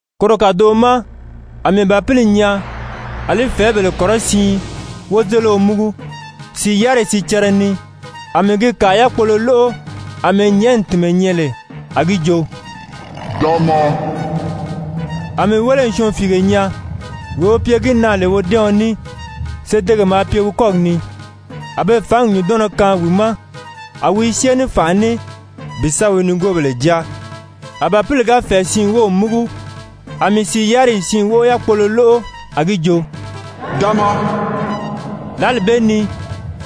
Koro kàdoʔo ma a mii Bàpili nyaa a li fɛ̀ɛ́bèle kɔrɔsiin wozelio múgu, sìi yáriyi sicɛrɛ ni, a mii gi kàa yákpolo lóʔo àmɛɛ nyɛ̀ʔɛni tìnmɛ nyɛ lè, a gi jo: «Da maa.» A mii wéle n syɔɔnfiige nyaa. Wee wi pye gi na lè wodɛ́ɛɔn ní, sedege maa pye wi kɔ́gi ni. A be fǎngi nyùndɔnnɔ kaan wi ma, a wi i syée ní fànʔa ní bi sa wi nigoobèle jáa. A Bàpili ga fɛ̀ɛ siin wów múgu, a mii sìi yáriyi siin wóʔo yákpolo lóʔo, a gi jo: «Da maa.» Lǎli bee ni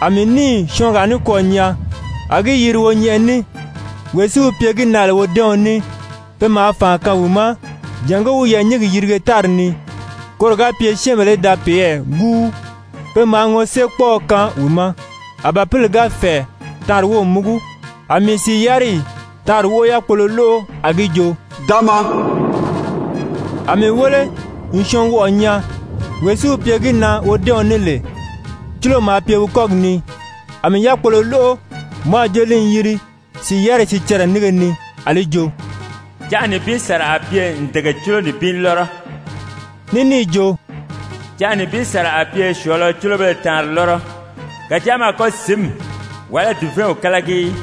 a mii níì syɔɔngaa nikwɔɔ nyaa, a gi yiri wonyɛnʔɛ ní. Wee si wi pye gi na lè wodɛ́ɛɔn ní, pe maa fànʔa kaan wi ma jàngó wi yɛɛ̀nyingi yirige tári ni, koro ga pye syɛ́ɛnbèle í da peyɛɛ gúu. Pe maa ŋɔséekpɔʔɔ kaan wi ma. A Bàpili ga fɛ̀ɛ taanri wów múgu, a mii sìi yáriyi taanri wóʔo yákpolo lóʔo, a gi joo: «Da maa.» A mii wéle n syɔɔnwɔʔɔ nyaa. Wee si wi pye gi na wodɛ́ɛɔn ní lè, cúlo maa pye wi kɔ́gi ni. A mii yákpolo lóʔo, mɔ a jo li n yiri sìi yáriyi sicɛrɛ nínge ni, a li jo: «Canʔa nibin sàra a pye ǹdege cúlo nibin lɔ́rɔ,» ní níì jo: «Canʔa nibin sàra a pye syɔ̀ɔ̄lɔ cúlobéle taanri lɔ́rɔ. Kàjáa mɔ a kɔ́ sǐnmi, wàlá dùvɛɛnw kálagi í.»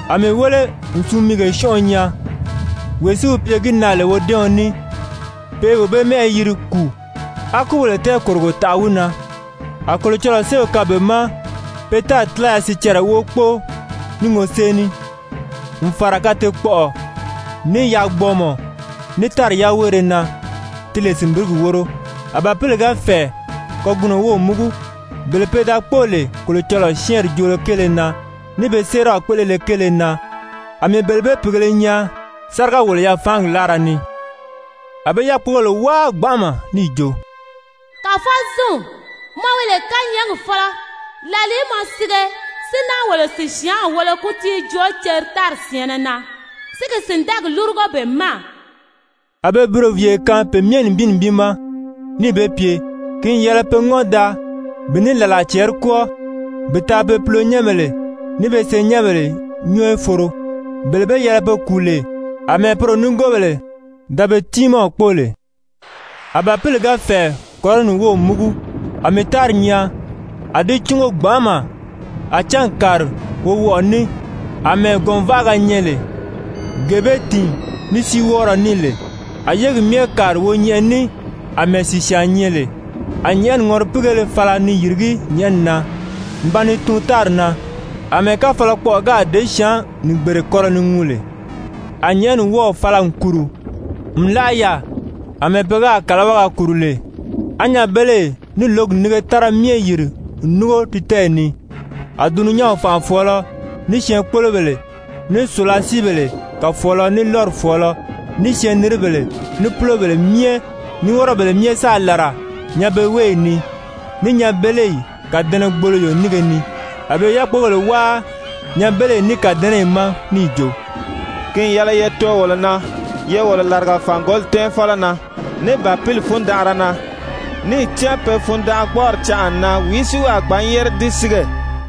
A mii wéle n sumiige syɔ́nʔɔ nyaa. Wee si wi pye gi na lè wodɛ́ɛɔn ní, pe i wee bee mɛ́ʔɛ yiri Kùu, á kúbèle tɛɛkòrogo taʔa wi na. A Kolocɔlɔɔ séew kaan be ma pe tári tílaya sicɛrɛ wóʔo kpóo ní ŋɔsée ní, n fàra kateekpɔʔɔ, ní yaagbɔɔmɔ, ní tári yaweere na, ti lè sìnbirigi wóro. A Bàpili ga fɛ̀ɛ kagunɔ wów múgu, bele pe da kpóo lè Kolocɔlɔɔ syɛ́ɛnri joolo kéele na, ní be séeraw kpéʔelele kéele na, a mii bele bee pìigēle nyaa sáriga-wòlo-yafaangi láara ni. A be yákpogèle wáa gbanʔama níì jo: «Kàfɔzinw, mɔ wi lè kányɛɛgi fɔ́lɔ, làlìí mɔ sige si náa wolo sìsyaanw wolo kútii joo ceri tári syɛ̀ɛnnɛ na, si gi sìndɛɛgi lúrugo be ma?» A be buroviiye kaan pe myɛ nibin nibin ma, níì be pye ki n yɛlɛ pe ŋɔ́n daa bi ní làla cɛɛri kwɔ́ɔ bi taa be pulonyɛnbèle ní be senyɛnbèle nyɔɔ í foro, bele be yɛlɛ be kùu lè àmɛɛ poro nigoobèle da be tiimaw kpóo lè. A Bàpili ga fɛ̀ɛ kɔrɔni wów múgu, a mii tári nyaa, a di cúngo gbanʔama, a cángi kàri wowɔʔɔ ní àmɛɛ gɔ̀nvaʔaga nyɛ lè, gee be tìin ní síiwɔɔrɔ ní lè. A yégi myɛ kàri wonyɛnʔɛ ní àmɛɛ sìsyaan nyɛ lè, a nyɛ̀ʔɛni ŋɔ́ripiigéle fala ni yìrigí nyɛ̀ʔɛni na n ba ni tuun tári na, àmɛɛ káfalakpɔʔɔ gáā děsyaan-nìgbere kɔlɔ ni ŋuu lè. A nyɛ̀ʔɛni wɔ́ɔ̀ fala n kùru n láʔa yaà àmɛɛ pe gáà kàlawaga kùru lè, á nyanbeleyi ní lǒgi nínge tára myɛ yìri n núngo di tɛ́ɛyi ni. A dulunyanw fànʔafɔɔlɔ, ní syɛɛnkpolobèle, ní sùlasiibèle kàfɔɔlɔ, ní lɔ́ri fɔ̀ɔlɔ, ní syɛɛnniribèle, ní púlobèle myɛ, ní wɔ́rɔbèle myɛ sáà làra nyanbeweeyi ni, ní nyanbeleyi kàdɛnɛgboloyo nínge ni. A be i yákpogèle wáa nyanbeleyi ní kàdɛnɛyi ma níì jo: «Ki n yɛlɛ ye too wolo na, ye wolo làriga fàngoli tɛ́ɛnfɔlɔ na, ní Bàpili fundanʔara na, níì cán pe fundanʔagbɔɔri canʔa n nan, wìí si wi a gbǎn yére di sige?»